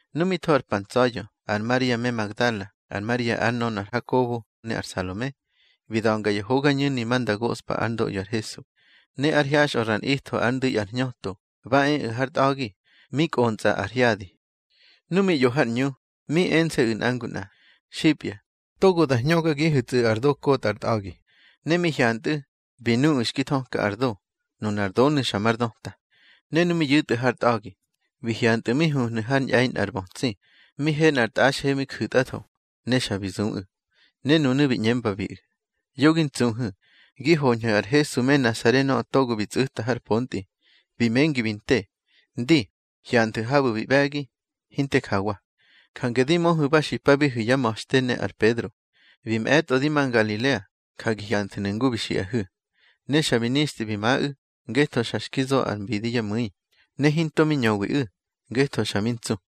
Nu mi tho ar pa ntsa̱ya̱, ar Maria me Magdala, ar Maria ár nönö ar Hakobo, ne ar Salome, bi da̱nga ya hogañu̱ni ma nda goꞌspa ár ndoꞌyo ar Hesu. Ne ár hyaxꞌö ra nꞌitho ár ndu̱i ar hñöto, ba eꞌu̱ har tꞌa̱gi, mi kꞌontsꞌa ar hyadi. Nu mi ꞌyo har ꞌñu, mi ense̱ꞌu̱ nꞌa ngu nꞌa: —Xipya, togo da hñögagihu̱tsꞌu̱ ar do kotꞌa ar tꞌa̱gi. Ne mi hyantꞌu̱, bi nuꞌu̱ xki thöka ar do. Nunar donu̱ xa mar döta. Ne nu mi yu̱tꞌu̱ har tꞌa̱gi, bi hyantꞌu̱ mi huhnu̱ har ñꞌe̱i nꞌar bötsi, mi he nꞌar tꞌaxhe mi ju̱tꞌatho. Ne xa bi zuꞌu̱. Ne nunu̱ bi ꞌñembabiꞌu̱: —Yo gi ntsuhu̱. Gi hoñhu̱ ar Hesu me Nasare nöꞌö togo bi tsꞌu̱ta har pontꞌi. Bi mengi bi nte. Ndi, hyanthu̱ habu̱ bi ꞌbe̱gi, hinte jawa. Jange di möhu̱ ba xipabihu̱ yá ma̱xte ne ar Pedro: Bi mꞌe̱tꞌo di ma Ngalilea, ja gi hyanthu̱nu̱ ngu bi xiꞌahu̱. Ne xa bi nixtꞌi bi maꞌu̱, ngetho xa xki zo ar mbidi yá mu̱i. Ne hinto mi ñöwiꞌu̱, ngetho xa mi ntsu.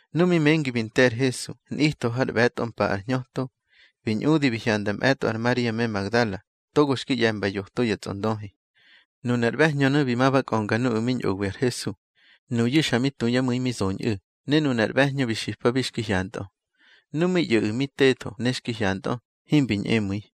Nu mi mengi bi nte ar Hesu nꞌitho har ꞌbe̱tꞌo mpa ar hñöto, bi ñꞌudi bi hyanda mꞌe̱tꞌo ar Maria me Magdala, togo xki ꞌye̱mba yoto ya tsꞌondöhi. Nunar ꞌbe̱hñönu̱ bi ma ba kꞌönga nuꞌu̱ mi ñꞌowi ar Hesu. Nuyu̱ xa mi tu yá mu̱i mi zoñꞌu̱, ne nunar ꞌbe̱hñö bi xipabi xki hyantꞌö. Nu mi ꞌyo̱ꞌu̱ mi tetho ne xki hyantꞌö, himbi ñꞌemu̱i.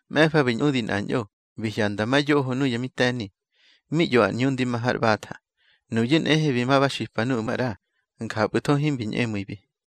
Mꞌe̱fa bi ñꞌudi nꞌañꞌo, bi hyanda ma yoho nuya mi te̱ni, mi ꞌyo ar ꞌñu ndi ma har ꞌbatha. Nuyu̱ nꞌehe bi ma ba xipa nuꞌu̱ maꞌra. Njapꞌu̱tho himbi ñꞌemu̱ibi.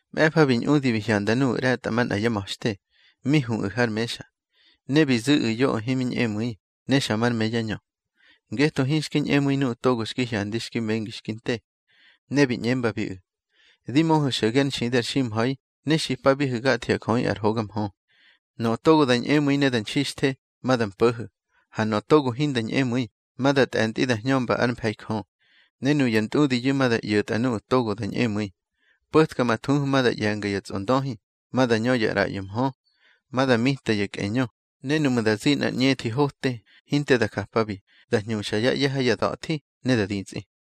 Mꞌe̱fa bi ñꞌudi bi hyanda nuꞌu̱ ꞌre̱tꞌamanꞌa yá ma̱xte, mi huꞌu̱ har mexa. Ne bi zu̱ꞌu̱ yoꞌö himi ñꞌemu̱i, ne xa mar me yá ñö, ngetho hinxki ñꞌemu̱i nuꞌu̱ togo xki hyandi xki mengi xki nte. Ne bi ꞌñembabiꞌu̱: —Di möhu̱ xo̱ge ár nxidi ar ximha̱i, ne xipabihu̱ gatho ya jöꞌi ar hoga mhö. Nöꞌö togo da ñꞌemu̱i ne da nxixthe, ma da mpo̱ho̱. Ha nöꞌö togo hinda ñꞌemu̱i, ma da tꞌe̱ntꞌi da hñömba ár mfe̱i Jö. Ne nuya ntꞌudiyu̱ ma da ꞌyo̱tꞌa nuꞌu̱ togo da ñꞌemu̱i: Po̱tka ma thuhu ma da ꞌye̱nga ya tsꞌondöhi, ma da ñö ya ꞌraꞌyo mhö, ma da mita ya kꞌeñö, ne nuꞌmu̱ da zi nꞌar ꞌñethi hote, hinte da japabi, da hñuxa yá ꞌye̱ ha ya da̱thi ne da ditsꞌi.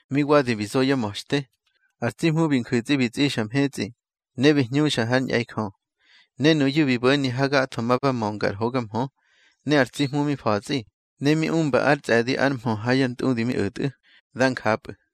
Mi wadi bi zo yá ma̱xte, ar tsi Hmu bi nju̱tsꞌi bi tsꞌixa mhetsꞌi, ne bi hñuxa hár ñꞌe̱i Jö. Ne nuyu̱ bi bo̱ni hagatho, ma ba mönga ar hoga mhö. Ne ar tsi Hmu mi fa̱tsꞌi, ne mi umba ár tsꞌe̱di ár mhö ha ya ntꞌudi mi o̱tꞌu̱. Dá njapꞌu̱.